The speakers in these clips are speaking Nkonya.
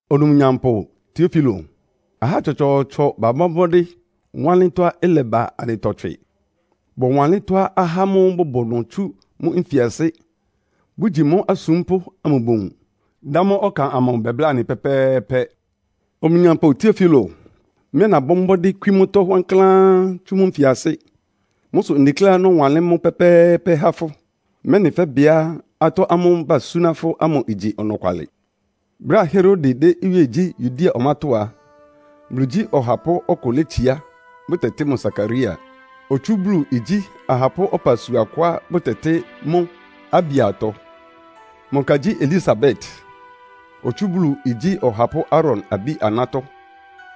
Onumnyampʋ Tiofilo: Ahá tsɔtsɔɔtsɔ babɔ́ mbɔ́dɩ́ wanlɩ́n tɔ́á ɩlɛba anɩtɔ tswɩ. Bɔwanlɩ́n tɔ́á ahá ámʋ́ʋ́ bʋbʋ ɩnʋ tsú mʋ́ nfiasɩ́, bʋgyi mʋ́ asúmpʋ́ amʋ bowun, dá mʋ́ ɔkan amʋ bɛbláa anɩ pɛ́pɛ́ɛ́pɛ́. Onumnyampʋ Tiofilo, mɩ́ ɛ́ nabɔ́ mbɔ́dɩ́ kwí mʋ́tɔ́ wankláán tsú mʋ́ nfiasɩ́. Mʋ́ sʋ ndekléá nɔ́wanlɩ́n mʋ́ pɛ́pɛ́ɛ́pɛ́ há fʋ́, mɛ́nɩ fɛ́bɩá atɔ́ ámʋ́ʋ́ basúná fʋ́ ámʋ igyi ɔnɔkwalɩ. Brɛ́á Herode dɛ́ iwíe gyí Yudea ɔmátɔ́ á, Bulu igyí ɔhapʋ́ ɔkʋ létsiá, bʋtɛtɩ́ mʋ Sakaria. Otsú Bulu igyí ahapʋ́ ɔpasua kʋá bʋtɛtɩ́ mʋ́ Abiatɔ. Mʋ ka gyí Elisabet, otsú Bulu igyí ɔhapʋ́ Aaron abí-anátɔ́.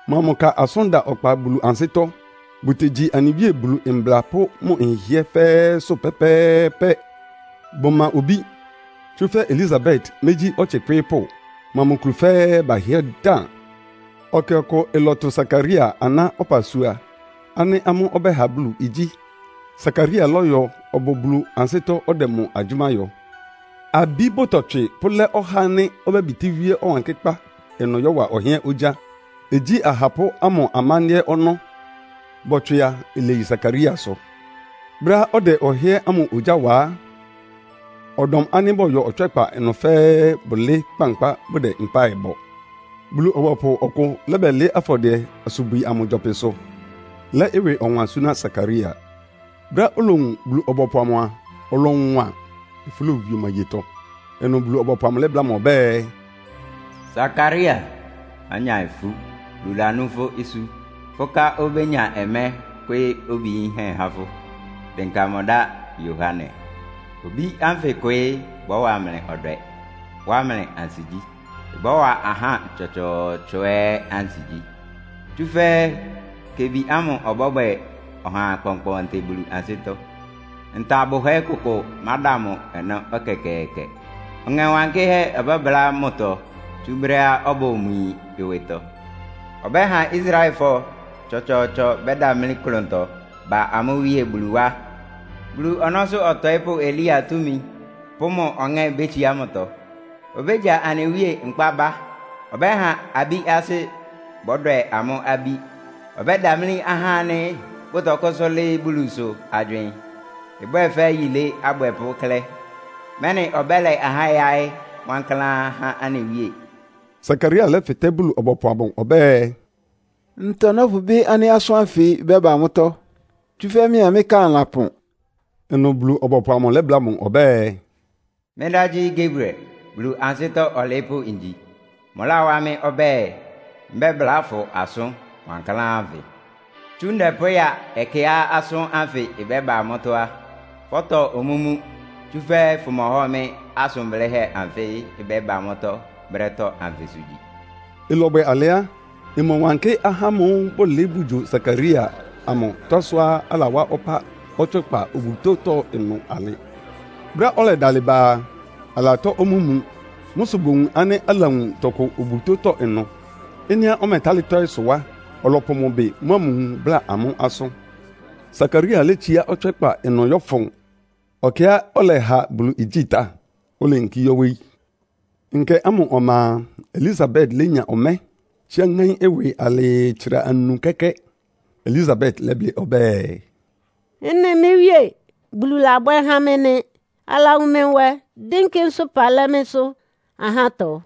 Mʋa mʋ ka asʋ́n da ɔkpa Bulu ansɩ́tɔ́. Bʋtegyi anɩ Wíe Bulu mbla pʋ́ mʋ nhɩhɩɛ́ fɛ́ɛ́sʋ́ pɛ́pɛ́ɛ́pɛ́. Bʋma obí, tsúfɛ́ Elisabet mégyí ɔtsɩ kwɩ́ɩ́pʋ́. Mʋa mʋ kulu fɛ́ɛ́ bahɩ́ɛ́ dan. Ɛkɛ ɔkʋ ɩlɔtʋ Sakaria aná ɔpasua ánɩ́ amʋ́ ɔbɛ́ha Bulu igyí. Sakaria lɔ́yɔ ɔbʋ Bulu ansɩ́tɔ́ ɔdɛ mʋ agyʋ́má yɔ. Abi bʋtɔtswɩ pʋlɛ́ ɔhá ánɩ́ obébitíwíe Ɔwankɩ́kpá ɩnʋ yɔ́wa ɔhɩ́ɛ́n ogyá, igyí ahapʋ́ ámʋ amándɩ́ɛ́ ɔnɔ́. Bɔtswɩ a, ileyi Sakariasʋ. Brɛ́á ɔdɛ ɔhɩ́ɛ́n ámʋ ogyá wa á, ɔdɔm ánɩ́ bɔyɔ ɔtswɛ́kpa ɩnʋ fɛ́ɛ́ bʋlɩɩ́ kpankpá bʋdɛ mpáɩ bɔ. Bulu-ɔbɔpʋ ɔkʋ lɛ́bɛlɩɩ́ afɔdɩɛ-asubwi ámʋ gyɔpɩsʋ, lɛ́ ɩwɩ ɔwan súná Sakaria. Brɛ́á olowun Bulu-ɔbɔpʋ amʋ a, ɔlɔwan, ifú lowie mʋ ayetɔ. Ɩnʋ Bulu-ɔbɔpʋ amʋ lɛ́bláa mʋ ɔbɛ́ɛ, “Sakaria, mánya ifú! Bulu lanú fʋ́ isú. Fʋ́ ká obénya ɔmɛ́ kwɩ́ɩ́ obi yinhɛ́ há fʋ́. Dɩnka mʋ dá ‘Yohane.’ Obí ánfɩ kwɩɩ́ bɔ́wa mlɩ ɔdwɛ, wá mlɩ ansigyí. Ɩbɔ́wa ahá tsɔtsɔɔtsɔ ɛ́ ansigyí. Tsúfɛ́ kebi ámʋ ɔbɔ́bwɛ ɔha kpɔnkpɔntɩ Bulu ansɩ́tɔ́. Nta bʋhɛ́ kʋkʋ máda mʋ ɔnɔ́ ɛkɛkɛɛkɛ. Ɔŋɛ Wankɩ́hɛ́ ɔbɔ́bʋlá mʋtɔ tsú brɛ́á ɔbʋ mʋ yin ɩwɩtɔ. Ɔbɛ́ha Israelfɔ tsɔtsɔɔtsɔ bɛ́damlí klʋntɔ ba amʋ́ Wíe Bulu wá. Bulu ɔnɔ́sʋ́ ɔtɔɩ́pʋ́Elia túmi pʋ́ mʋ ɔŋɛ́ bétsiá mʋtɔ. Obégya anɩ Wíe nkpá bá. Ɔbɛ́ha abí asɩ́ bɔ́dwɛ amʋ́ abí, ɔbɛ́damlí ahá ánɩ́ bʋtɔkʋ́sʋ́ lɩ́ɩ́ Bulusʋ agywɩɩn, ɩbwɛ fɛ́ yilé abwɛpʋ́ klɛ́, mɛ́nɩ ɔbɛ́la ahá yáɩ́ wankláán há anɩ Wíe.” Sakaria lɛ́fɩtɛ́ Bulu-ɔbɔpʋ amʋ ɔbɛ́ɛ, “Ntɔ nɔ́pʋbɩ́ ánɩ́ asʋ́n ánfɩ ɩbɛ́ba mʋ́tɔ́? Tsúfɛ́ mɩ́a mɩ́ ká anɩlapɔn.” Ɩnʋ Bulu-ɔbɔpʋ amʋ lɛ́bláa mʋ ɔbɛ́ɛ, “Mɩ́ dá gyí Gabriel. Bulu ansɩ́tɔ́ ɔlɩɩ́pʋ́ ngyi. Mʋláwá mɩ́ ɔbɛ́ɛ, mbɛ́bláa fʋ asʋn wankláán ánfɩ. Tsú ndɛ pʋ́ya ɛkɛá asʋ́n ánfɩ ɩbɛ́ba mʋ́tɔ́ á, fɔ́tɔ omúmu, tsúfɛ́ fʋmɔhɔ mɩ́ asʋn blɩ́hɛ́ anfɩ́ ɩbɛ́ba mʋ́ brɛ́tɔ́ anfɩsʋ gyi.” Ɩlɔbwɛ alɩ á, ɩmɔwánkɩ́ ahá ámʋ́ʋ́ bʋlɩɩ́ bʋgyo Sakaria amʋ tɔ́á sʋá alawá ɔpá ɔtswɛ́kpa obutótɔ́ ɩnʋ alɩ. Brɛ́á ɔlɛdalɩ ba a, alatɔ́ omúmu. Mʋ́ sʋ bowun ánɩ́ alawun tɔkʋ obutótɔ́ ɩnʋ. Ɩ́nɩá ɔmɛtálɩ́ tɔ́ɩ́ sʋ á, ɔlɔpʋ mʋ ɩbɩ mʋ́a mʋ nwun bláa amʋ́ asʋ́n. Sakaria létsiá ɔtswɛ́kpa ɩnʋ yɔ́fʋn ɛkɛá ɔlɛha Bulu igyí tá, oleyinkí yɔ́ wóyí. Nkɛ ámʋ ɔma a, Elisabet lénya ɔmɛ́, tsíá ŋáín ɩwɩ alɩɩ tsra anu kɛ́kɛ́. Elisabet lɛ́blɩ́ ɔbɛ́ɛ, “Ɩ́nɩ mɩ́ Wíe Bulu labwɛ́ há mɩ́ nɩ́. Alawun mɩ́ nwɛ, dɩ́nkɩ́ nsʋ́pa lɛ́ mɩ́sʋ́ ahátɔ.”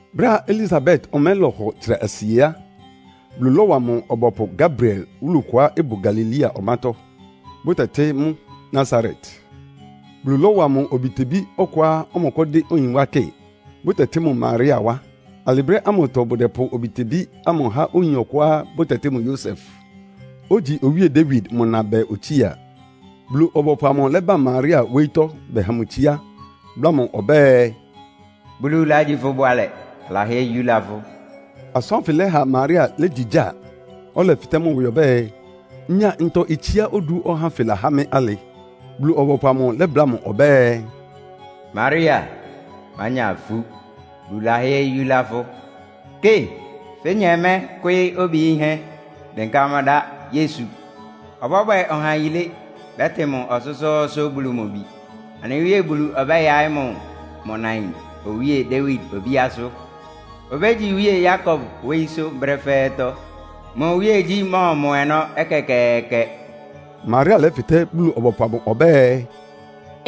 Brɛ́á Elisabet ɔmɛ́ lɔhɔ tsra asie á, Bulu lɔ́wa mʋ ɔbɔpʋ Gabriel wúlu kʋá ɩbʋ Galilea ɔmátɔ́, bʋtɛtɩ́ mʋ́ Nasaret. Bulu lɔ́wa mʋ obitebí ɔkʋá ɔmɔkʋ́dɩ́ oyin wá kɩ, bʋtɛtɩ́ mʋ Maria wá. Alɩ brɛ́ ámʋtɔ bʋdɛpʋ obitebí ámʋ há oyin ɔkʋá bʋtɛtɩ́ mʋ Yosef, ogyi owíe Dawid mʋ na bɛɛ otsía. Bulu-ɔbɔpʋ amʋ lɛ́ba Maria wóyítɔ́ bɛha mʋ itsiá, bláa mʋ ɔbɛ́ɛ, “Bulu lagyi fʋ bʋalɛ, alahɩ́ɛ́ yúlá fʋ́!” Asʋ́n ánfɩ lɛha Maria légyigyáa, ɔlɛfɩtɛ́ mʋ ɩwɩ ɔbɛ́ɛ, “Ngya ntɔ itsiá odu ɔhá ánfɩ lahá mɩ́ alɩ?” Bulu-ɔbɔpʋ amʋ lɛ́bláa mʋ ɔbɛ́ɛ, “Maria, mánya ifú. Bulu lahɩ́ɛ́ yúlá fʋ́! Kɩ, fénya ɔmɛ́ kwɩ́ɩ́ obi yinhɛ́. Dɩnka mʋ dá ‘Yesu.’ Ɔbɔ́bwɛ ɔha yilé. Bɛ́tɩ mʋ Ɔsʋ́sʋ́ʋ́sʋ́ Bulu mʋ Bi. Anɩ Wíe Bulu ɔbɛ́yaɩ́ mʋ mʋ nain Owíe Dawid obíásʋ́. Obégyi iwíe Yakob wóyísʋ́ brɛ́ fɛ́ɛ́tɔ́. Mʋ iwíegyí mɔ́ɔmɔ ɔnɔ́ ɛkɛkɛɛkɛ.” Maria lɛ́fɩtɛ́ Bulu-ɔbɔpʋ amʋ ɔbɛ́ɛ,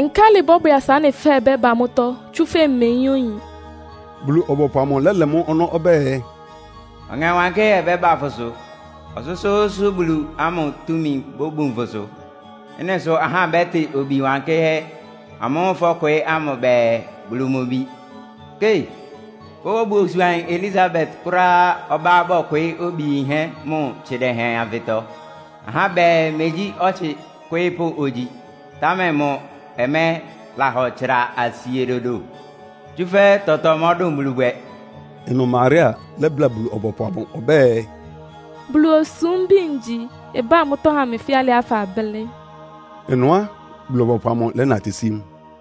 “Nkálɩ ɩbɔ́bwɛ asa ɩ́nɩ ɩbɛ́ba mʋ́tɔ́, tsúfɛ́ mmeyín oyin.” Bulu-ɔbɔpʋ amʋ lɛ́lɛ mʋ́ ɔnɔ́ ɔbɛ́ɛ, “Ɔŋɛ Wankɩ́hɛ́ ɔbɛ́ba fʋsʋ. Ɔsʋ́sʋ́ʋ́sʋ́ Bulu ámʋ túmi bóbun fʋsʋ. Ɩ́nɩ sʋ ahá bɛ́tɩ Obi wankɩ́hɛ́ amʋ́ʋ́ fɔ́kwɩɩ́ ámʋ bɛɛ, ‘Bulu mʋ Bi.’ Kɩ, fʋ́ obusuanyin Elisabet kʋ́ráá ɔbá bɔkwɩɩ́ obi yinhɛ́ mʋ tsɩdɛhɛn anfɩtɔ. Ahá bɛɛ, megyí ɔtsɩ kwɩ́ɩ́pʋ́ ogyi, támɛ mʋ ɔmɛ́ lahɔ tsra asie dodo. Tsúfɛ́ tɔtɔ mɔdʋ́n Bulu bwɛ!” Ɩnʋ Maria lɛ́bláa Bulu-ɔbɔpʋ amʋ ɔbɛ́ɛ, “Bulu osúmbi ngyi. Ɩbá mʋ́tɔ́ ha mɩ fɛ́ alɩá fablɩ́.” Ɩnʋ á, Bulu-ɔbɔpʋ amʋ lɛ́natɩ́ sí mʋ.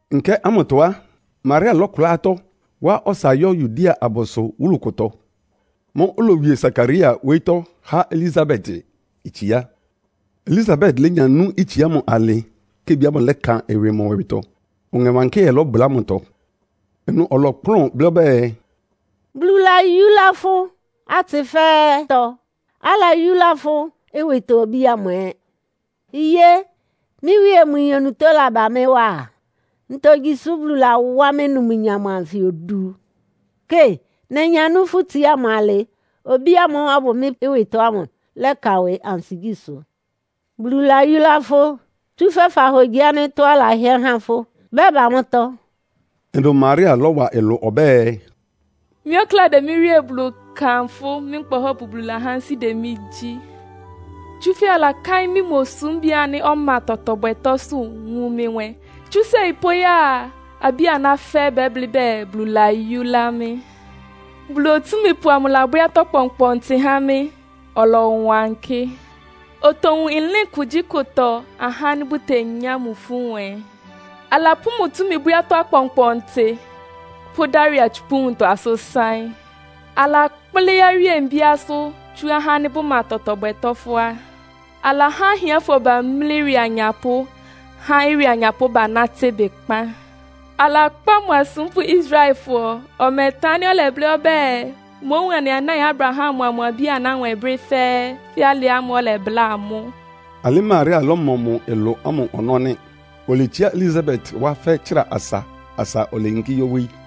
Nkɛ ámʋtɔ á, Maria lɔ́kʋlá atɔ́, wa ɔsa yɔ́ Yudea abʋsʋ wúlu kʋtɔ. Mʋ́ʋ́ olowie Sakaria wóyítɔ́ há Elisabet itsiá. Elisabet lénya nú itsiá ámʋ alɩ́ kebi ámʋ lɛ́kan ɩwɩ mʋ ɩwɩtɔ, Ɔŋɛ Wankɩ́hɛ́ lɔbʋlá mʋtɔ. Ɩnʋ ɔlɔkplʋ́n blɩ́ ɔbɛ́ɛ, “Bulu layúlá fʋ́ atsɩ fɛ́ɛ́tɔ́. Alayúlá fʋ́ ɩwɩtɔ obí ámʋ ɛ́. Iyé! Mɩ́ Wíe mʋ yin onutó lába mɩ́ wá á? Ntogyi sʋ́ Bulu lawá mɩ́ numnyam anfɩ odu? Kɩ, nenyanú fʋ́ itsiá ámʋ alɩ obí ámʋ́ʋ́ ɔbʋ mɩ́ ɩwɩtɔ ámʋ lɛ́kan ɩwɩ ansigyísʋ́. Bulu layúlá fʋ́, tsúfɛ́ fahogyi ánɩ́ tɔ́á alahɩ́ɛ́ há fʋ́ ɩbɛ́ba mʋ́tɔ́.” Ɩnʋ Maria lɔ́wa ɩlʋ ɔbɛ́ɛ, “Mɩ́ ɔkláa dɛ́ mɩ́ Wíe Bulu kanfʋ́. Mɩ́ Nkpa Ɔhɔ́pʋ Bulu lahá ansɩ́ dɛ mɩ́ gyí. Tsúfɛ́ alakáɩ́n mɩ́ mʋ osúmbi ánɩ́ ɔma tɔtɔ bwɛtɔ́sʋ́, wun mɩ nwɛ. Tsú séi pʋ́ya a, abí-aná fɛ́ɛ́ bɛ́blɩ́ bɛɛ, Bulu layúlá mɩ́. Bulu Otúmípʋ amʋ labwɛ́ atɔ́ kpɔnkpɔntɩ há mɩ́. Ɔlɔwankɩ́. Otowun ɩlɩ́n kugyíkʋtɔ ahá ánɩ́ bʋtenyá mʋ ifú nwɛ. Alapʋ́ mʋ túmi bwɛ́ atɔ́ akpɔnkpɔntɩ, pʋ́dá ɩwɩ atsupʋ́ nwuntɔ asʋ́n sáɩ́n. Alakplɩ́ awíe mbíásʋ́, tsú ahá ánɩ́ bʋma tɔtɔ bwɛtɔ́ fʋ́á. Alahá ahiánfɔ bamlí ɩwɩ anyapʋ́, há ɩwɩ anyapʋ́ banátɩ́ ɩbɩkpan. Alakpá mʋ asúmpʋ́ Israelfɔ. Ɔmɛtan ánɩ́ ɔlɛblɩ́ ɔbɛ́ɛ, mówun anɩ anáin Abraham mʋa mʋ abí-aná nwɛ brɛ́ fɛ́ɛ́, fɛ́ alɩá ɔlɛbláa amʋ́.” Alɩ Maria lɔ́mɔ mʋ ɩlʋ ámʋ ɔnɔ́ nɩ́. Oletsiá Elisabet wá fɛ́ tsra asa asa oleyinkí yɔ́ wóyí.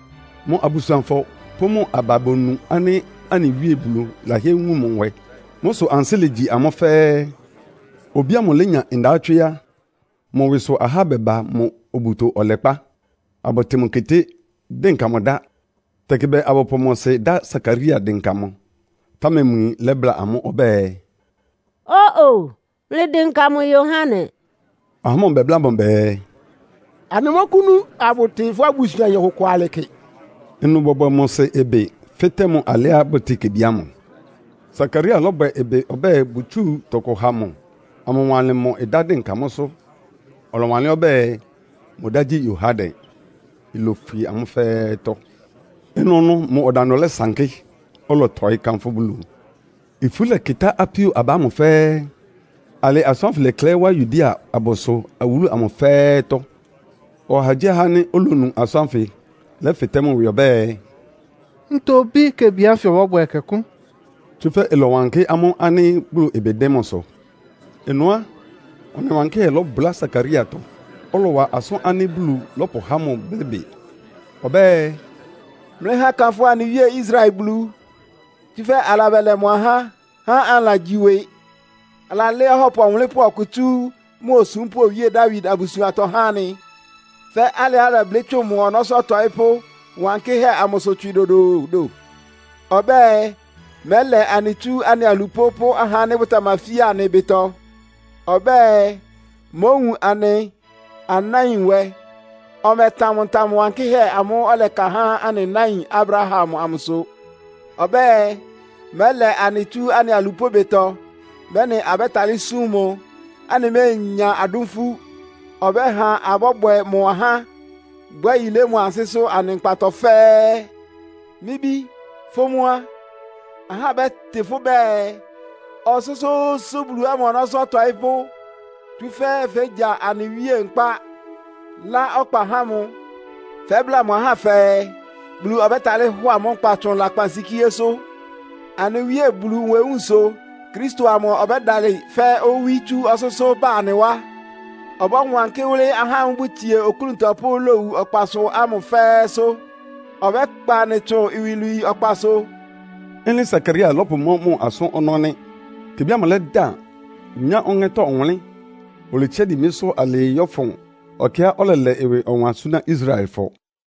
Mʋ abusuanfɔ pʋ́ mʋ aba bonu ánɩ́ anɩ Wíe Bulu lahɩ́ɛ́ wun mʋ nwɛ. Mʋ́ sʋ ansɩ́ légyi amʋ́ fɛ́ɛ́. Obí ámʋ lénya ndawɔ́tswɩ́ á, mʋ ɩwɩsʋ ahá bɛba mʋ obuto ɔlɛkpá, abʋtɩn mʋ keté, dɩnka mʋ dá. Tɛkɩ bɛɛ abʋpʋ mʋ sɩ dá Sakaria dɩnka mʋ, támɛ mʋ yin lɛ́bláa amʋ́ ɔbɛ́ɛ, “Ó-o! Mlɩdɩnka mʋ Yohane.” Ahá ámʋ bɛbláa mʋ bɛɛ, “Anɩmɔ́kʋ́nú abʋtɩ fʋ́ obusuanyin ɔkʋkʋ alɩ kɩ.” Ɩnʋ bɔbwɛ mʋ sɩ ɩbɩ, fɩ́tɛ́ mʋ alɩá bʋtɩ́ɩ kebi ámʋ. Sakaria lɔ́bwɛ ɩbɩ ɔbɛ́ɛ bʋtsúu tɔkʋ ha mʋ amʋwanlɩn mʋ́ dɩnka mʋ́sʋ́, ɔlɔwanlɩ́n ɔbɛ́ɛ, “Mʋ dá gyí ‘Yohane.’” Ilofwie amʋ́ fɛ́ɛ́tɔ́. Ɩnʋnʋ mʋ ɔdandʋ lɛsankɩ́, ɔlɔtɔɩ́ kánfʋ́ Bulu. Ifú lɛkɩtá apíó aba ámʋ fɛ́ɛ́. Alɩ asʋ́n ánfɩ lɛklɛɩ́ wá Yudea abʋsʋ awúlu amʋ fɛ́ɛ́tɔ́. Ɔhagyíɔha ánɩ́ olonu asʋ́n ánfɩ lɛ́fɩtɛ́ mʋ ɩwɩ ɔbɛ́ɛ, “Ntɔ obí kebi ánfɩ ɔbɔ́bwɛ ɛkɛkʋ́?” Tsúfɛ́ ɩlɔwankɩ́ amʋ́ ánɩ́ Bulu ɩbɩ dɩ́n mʋsʋ. Ɩnʋ á, Ɔŋɛ Wankɩ́hɛ́ lɔbʋlá Sakariatɔ, ɔlɔwa asʋ́n ánɩ́ Bulu lapʋ́há mʋ blɩ́ bɩ. Ɔbɛ́ɛ, “Mlɩha akanfʋ anɩ Wíe Israel Bulu. Tsúfɛ́ alabɛlɛ mʋ ahá, há anɩlagyi ɩwɩ. Alalɛ́ Ɔhɔ́pʋ Ɔwʋnlɩ́npʋ́ ɔkʋ tsú mʋ osúmpʋ́ Owíe Dawid abusuantɔ há anɩ. (Fɛ́ alɩá ɔlɛblɩ́ tsʋn mʋ ɔnɔ́sʋ́ atɔɩ́pʋ́ wankɩ́hɛ́ amʋsʋ tswɩ dodoodo.) Ɔbɛ́ɛ, mɛ́lɛ anɩ tsú anɩ alupʋ́ pʋ́ ahá ánɩ́ bʋtamafia anɩ ɩbɩtɔ. Ɔbɛ́ɛ, mówun anɩ anáin nwɛ. Ɔmɛ́ɛtan mʋ ntam wankɩ́hɛ́ amʋ́ʋ́ ɔlɛka há anɩ náin Abraham amʋsʋ. Ɔbɛ́ɛ, mɛ́lɛ anɩ tsú anɩ alupʋ́ ɩbɩtɔ, mɛ́nɩ abɛ́talɩ́ súm mʋ, anɩméenya adʋ́n ifú. Ɔbɛ́ha abɔ́bwɛ mʋ ahá, bwɛ́ yilé mʋ ansɩ́sʋ́ anɩ nkpatɔ fɛ́ɛ́. Mɩ́ bí, fʋ́ mʋ́ á, ahá bɛ́tɩ fʋ́ bɛɛ, ‘Ɔsʋ́sʋ́ʋ́sʋ́ Bulu ámʋ ɔnɔ́sʋ́ ɔtɔɩ́pʋ́.’ Tsúfɛ́ fégya anɩ Wíe nkpá, lá ɔkpa há mʋ. Fɛ́bláa mʋ ahá fɛɛ, Bulu ɔbɛ́talɩ́ hɔ amʋ́ nkpa tsʋn lakpansikíésʋ́. Anɩ Wíe Bulu nwewúun sʋ Kristo amʋ ɔbɛ́dalɩ fɛ́ owí tsú ɔsʋ́sʋ́ ba anɩ wá. Ɔbɔ́wankɩ́ wʋ́lɩ́ ahá ámʋ́ʋ́ bʋtsie oklúntɔ pʋ́ lowu ɔkpasʋ ámʋ fɛ́ɛ́sʋ́. Ɔbɛ́kpa anɩ tsʋn iwilwii ɔkpasʋ.” Ɩ́nɩ Sakaria lɔ́pʋmɔ́ mʋ asʋ́n ɔnɔ́ nɩ́. Kebi ámʋ lɛ́dan, nya Ɔŋɛ́tɔ́ ɔwʋnlɩ́n. Oletsiá dimbísʋ́ alɩɩ yɔ́fʋn ɛkɛá ɔlɛlɛ ɩwɩ ɔwan súná Israelfɔ.